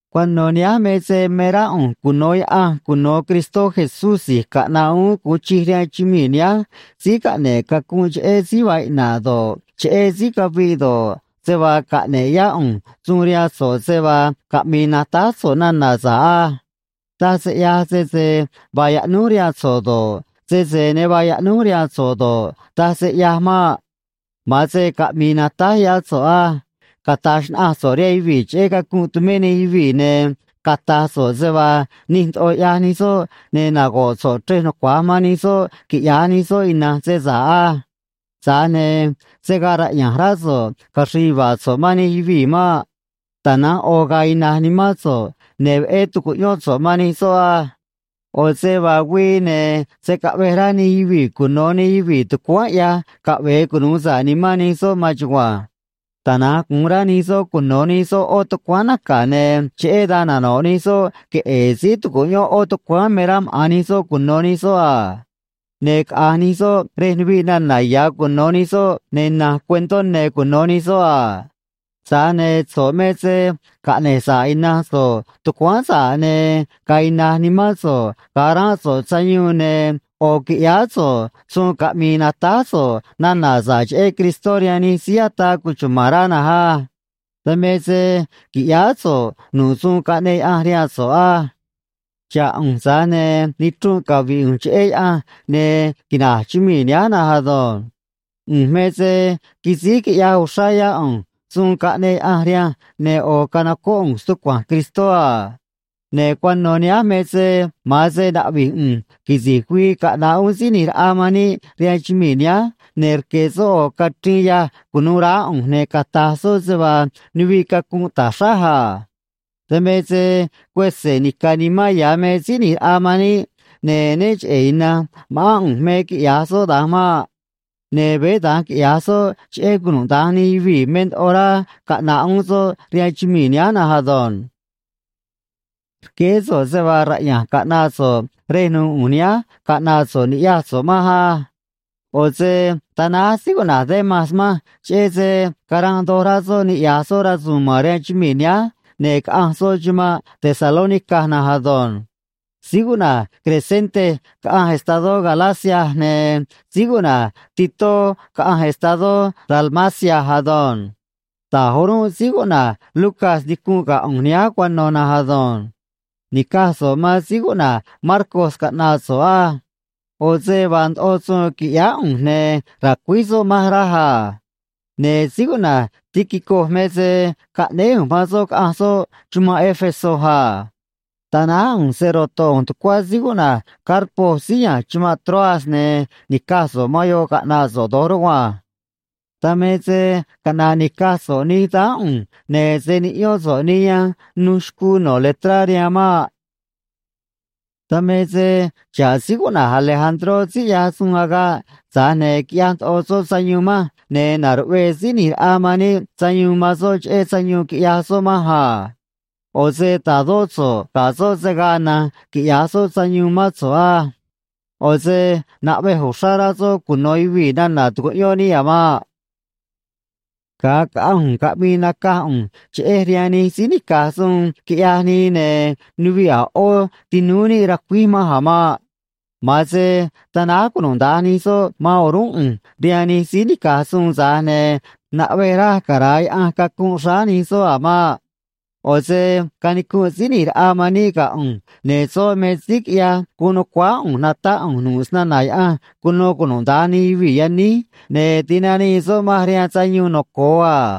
Cuano̱ nihánj me se me rá ꞌu̱nj cuno̱ Yaꞌanj cuno̱ Cristó Jesús si̱j caꞌna̱ꞌ uún gu̱un chij rihaan chumii̱ nihánj síí caꞌne̱ꞌ cacunꞌ cheꞌé síí vaa iꞌna̱ꞌ do̱ꞌ, cheꞌé síí caviꞌ do̱ꞌ, se vaa caꞌne̱ꞌ yá ꞌu̱nj suun rihaan so̱ꞌ se vaa caꞌmi̱i̱ natáj so̱ꞌ nana̱ sa̱ꞌ á. Taj se ꞌyaj sese vaa yaꞌnúj rihaan so̱ꞌ do̱ꞌ, sese ne vaa yaꞌnúj rihaan so̱ꞌ do̱ꞌ, taj se ꞌyaj maꞌ. Ma̱an se caꞌmi̱i̱ natáj yá so̱ꞌ á. Cata̱j xnaꞌanj so̱ꞌ rihaan yuvii̱ cheꞌé cacunꞌ tumé nij yuvii̱, ne̱ cata̱j so̱ꞌ se vaa nij ndoꞌo ꞌyaj nij soꞌ, ne̱ nago̱ꞌ so̱ꞌ chrej nucua̱j man nij soꞌ quiꞌya̱j nij soꞌ ina̱nj se sa̱ꞌ á. Tza̱j ne̱ se̱ gaa raꞌya̱nj rá so̱ꞌ caxri̱i̱ yuva̱a̱ so̱ꞌ man nij yuvii̱ maꞌ. Tana̱nj ꞌo̱ ga̱a̱ ina̱j nimán so̱ꞌ, ne̱ veꞌé tu̱cuꞌyón so̱ꞌ man nij soꞌ á. ꞌO̱ se vaa güii, ne̱ se̱ caꞌvej rá nij yuvii̱ cuno̱ nij yuvii̱ tucuáán ꞌyaj caꞌve̱e cunu̱u sa̱ꞌ nimán nij soꞌ maan chugua̱nj. Tana̱nj gu̱un rá nij soꞌ cuno̱ nij soꞌ ꞌó tucuáán naca̱, ne̱ cheꞌé dan nano̱ꞌ nij soꞌ queꞌe̱e̱ síí tu̱cuꞌyón ꞌó tucuáán me rá maꞌa̱n nij soꞌ cuno̱ nij soꞌ a. Ne̱ caꞌa̱nj nij soꞌ rej nuviꞌ nana̱ ya̱ cuno̱ nij soꞌ, ne̱ na̱nj cuentó ne̱ cuno̱ nij soꞌ a. Tza̱j ne̱ so̱ꞌ me se caꞌne̱j sa̱ꞌ ina̱nj so̱ꞌ tucuáán sa̱ꞌ, ne̱ ga̱a̱ ina̱j nimán so̱ꞌ ga̱a ránꞌ so̱ꞌ sayuun, ne̱ ꞌo̱ qui̱ꞌyáá so̱ꞌ suun caꞌmi̱i̱ natáj so̱ꞌ nana̱ sa̱ꞌ cheꞌé Cristó rihaan nij síí ataa cuchuma̱n rá na̱nj á. Dan me se quiꞌyáá so̱ꞌ nu̱ꞌ suun caꞌneꞌ Yaꞌanj rihaan so̱ꞌ á. Xa̱ꞌ ꞌu̱nj, tza̱j ne̱ nichrunꞌ cavi̱ꞌ ꞌu̱nj cheꞌé Yaꞌanj, ne̱ quina̱j chumii̱ nihánj na̱nj ado̱nj. ꞌU̱nj me se quisíj quiꞌyaj uxrá yá ꞌu̱nj suun caꞌneꞌ Yaꞌanj rihanj, ne̱ ꞌo̱ canocóꞌ ꞌu̱nj stucua̱nj Cristó a. Ne̱ cuano̱ nihánj me se ma̱an se naꞌvi̱j ꞌu̱nj quisi̱j güii caꞌna̱ꞌ uún Síí ꞌNi̱j Raꞌa man níꞌ rihaan chumii̱ nihánj, ne̱ rque̱ soꞌ ꞌo̱ cachriin yâj cu̱nuû raá ꞌu̱nj, ne̱ cata̱j soꞌ se vaa nuviꞌ cacunꞌ ta̱j xráj a. Dan me se cuese̱ nica̱ nimán ya̱ me Síí ꞌNi̱j Raꞌa man níꞌ, ne̱ né cheꞌe̱ ina̱nj ma̱ꞌán ꞌu̱nj me quiꞌya̱j soꞌ da̱nj maꞌ. Ne̱ veé da̱nj quiꞌya̱j soꞌ cheꞌé cunuda̱nj nij yuvii̱ me ndoꞌo rá caꞌna̱ꞌ uún soꞌ rihaan chumii̱ nihánj na̱nj ado̱nj. Rqueé so̱ꞌ se vaa raꞌya̱nj caꞌna̱ꞌ so̱ꞌ rej nu̱u̱ ꞌu̱nj nihánj caꞌna̱ꞌ so̱ꞌ ni̱ꞌyaj so̱ꞌ manj á. ꞌO̱ se tanáj síí cuꞌna̱j Demas manj, cheꞌé se caranꞌ doj rá soꞌ niꞌya̱j soꞌ rasu̱u̱n ma̱n rihaan chumii̱ nihánj, ne̱ caꞌanj soꞌ chumanꞌ Tesalónica na̱nj ado̱nj. Síí cuꞌna̱j Crescente caꞌanj estadó Galacia, ne̱ síí cuꞌna̱j Titó caꞌanj estadó Dalmacia ado̱nj. Da̱j o̱rúnꞌ síí cuꞌna̱j Lucas nicunꞌ ga̱ ꞌu̱nj nihánj cuano̱ na̱nj ado̱nj. Ni̱caj so̱ꞌ man síí cuꞌna̱j Marcos caꞌna̱ꞌ so̱ꞌ á. ꞌO̱ se vaa ndoꞌo suun qui̱ꞌyáá ꞌu̱nj, ne̱ ra̱cuíj soꞌ manj, raj a. Ne̱ síí cuꞌna̱j Tíquico me se caꞌnéé ꞌu̱nj man soꞌ caꞌa̱nj soꞌ chumanꞌ Éfeso a. Tanáj ꞌu̱nj se‑ro̱to̱ ꞌu̱nj tucuá síí cuꞌna̱j Carpo síí ya̱nj chumanꞌ Troas, ne̱ ni̱caj so̱ꞌ man yoꞌ caꞌna̱ꞌ so̱ꞌ do̱j rugua̱nj. Dan me se caꞌna̱ꞌ ni̱caj so̱ꞌ nij dáán ꞌu̱nj, ne̱ se̱ niꞌyón so̱ꞌ nij yanj nuj xcuu no̱ letrá rihaan maꞌ. Dan me se xa̱ꞌ síí cuꞌna̱j Alejandró síí ꞌyaj suun agaꞌ, tza̱j ne̱ quiꞌyaj ndoꞌo soꞌ sayuun manj, ne̱ na̱ruꞌvee Síí ꞌNi̱j Raꞌa man níꞌ sayuun man soꞌ cheꞌé sayuun quiꞌyaj soꞌ manj a. ꞌO̱ se ta̱dó so̱ꞌ ga̱ soꞌ se̱ gaa na̱nj quiꞌya̱j soꞌ sayuun mán so̱ꞌ á. ꞌO̱ se naꞌvej uxrá rá soꞌ cuno̱ yuvii̱ nana̱ tucuꞌyón níꞌ a̱ maꞌ. Ga̱a caꞌanj ꞌu̱nj caꞌmi̱i̱ nacaj ꞌu̱nj cheꞌej rihaan nij síí nica̱j suun quiꞌyaj nii, ne̱ nuviꞌ a̱ ꞌó tinúú níꞌ racuíj manj a̱ maꞌ. Ma̱an se tanáj cunuda̱nj nij soꞌ man o̱rúnꞌ ꞌu̱nj rihaan nij síí nica̱j suun, tza̱j ne̱ naꞌvej raj cara̱a Yaꞌanj cacunꞌ xráá nij soꞌ a̱ maꞌ. ꞌO̱ se canicunꞌ Síí ꞌNi̱j Raꞌa man níꞌ ga̱ ꞌu̱nj, ne̱ soꞌ me síí quiꞌyaj guun nu̱cuáá ꞌu̱nj natáꞌ ꞌu̱nj nu̱ꞌ snana̱ Yaꞌanj cuno cunuda̱nj nij yuvii̱ yaníj, ne̱ tinanii soꞌ manj rihaan sayuun noco̱o a.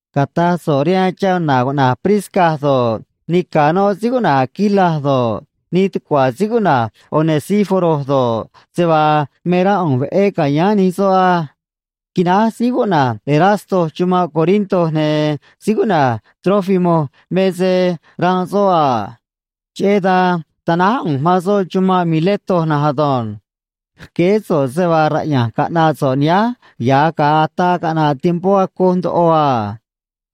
Cata̱j so̱ꞌ rihaan chana̱ cuꞌna̱j Prisca do̱ꞌ, nica̱ noꞌ síí cuꞌna̱j Aquila do̱ꞌ, nij tucua̱ síí cuꞌna̱j Onesíforo do̱ꞌ, se vaa me rá ꞌu̱nj veꞌé ca̱yáán nij soꞌ á. Quináj síí cuꞌna̱j Erasto chumanꞌ Corinto, ne̱ síí cuꞌna̱j Trófimo me se ranꞌ soꞌ a. Cheꞌé dan tanáj ꞌu̱nj man soꞌ chumanꞌ Mileto na̱nj ado̱nj. Rqueé so̱ꞌ se vaa raꞌya̱nj caꞌna̱ꞌ so̱ꞌ nihánj ya̱j ga̱a ataa caꞌna̱ꞌ tiempó acoj ndoꞌo a.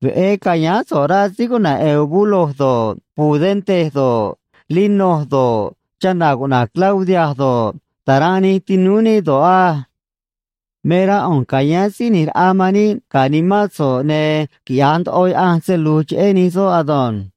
Veꞌé ca̱yáán so̱ꞌ, rá síí cuꞌna̱j Eubulo do̱ꞌ, Pudente do̱ꞌ, Lino do̱ꞌ, chana̱ cuꞌna̱j Claudia do̱ꞌ, ta̱ranꞌ nij tinúú níꞌ do̱ꞌ á. Me rá ꞌu̱nj ca̱yáán Síí ꞌNi̱j Raꞌa man níꞌ ga̱ nimán so̱ꞌ, ne̱ quiꞌya̱j ndoꞌo Yaꞌanj se lu̱j cheꞌé nij soj ado̱nj.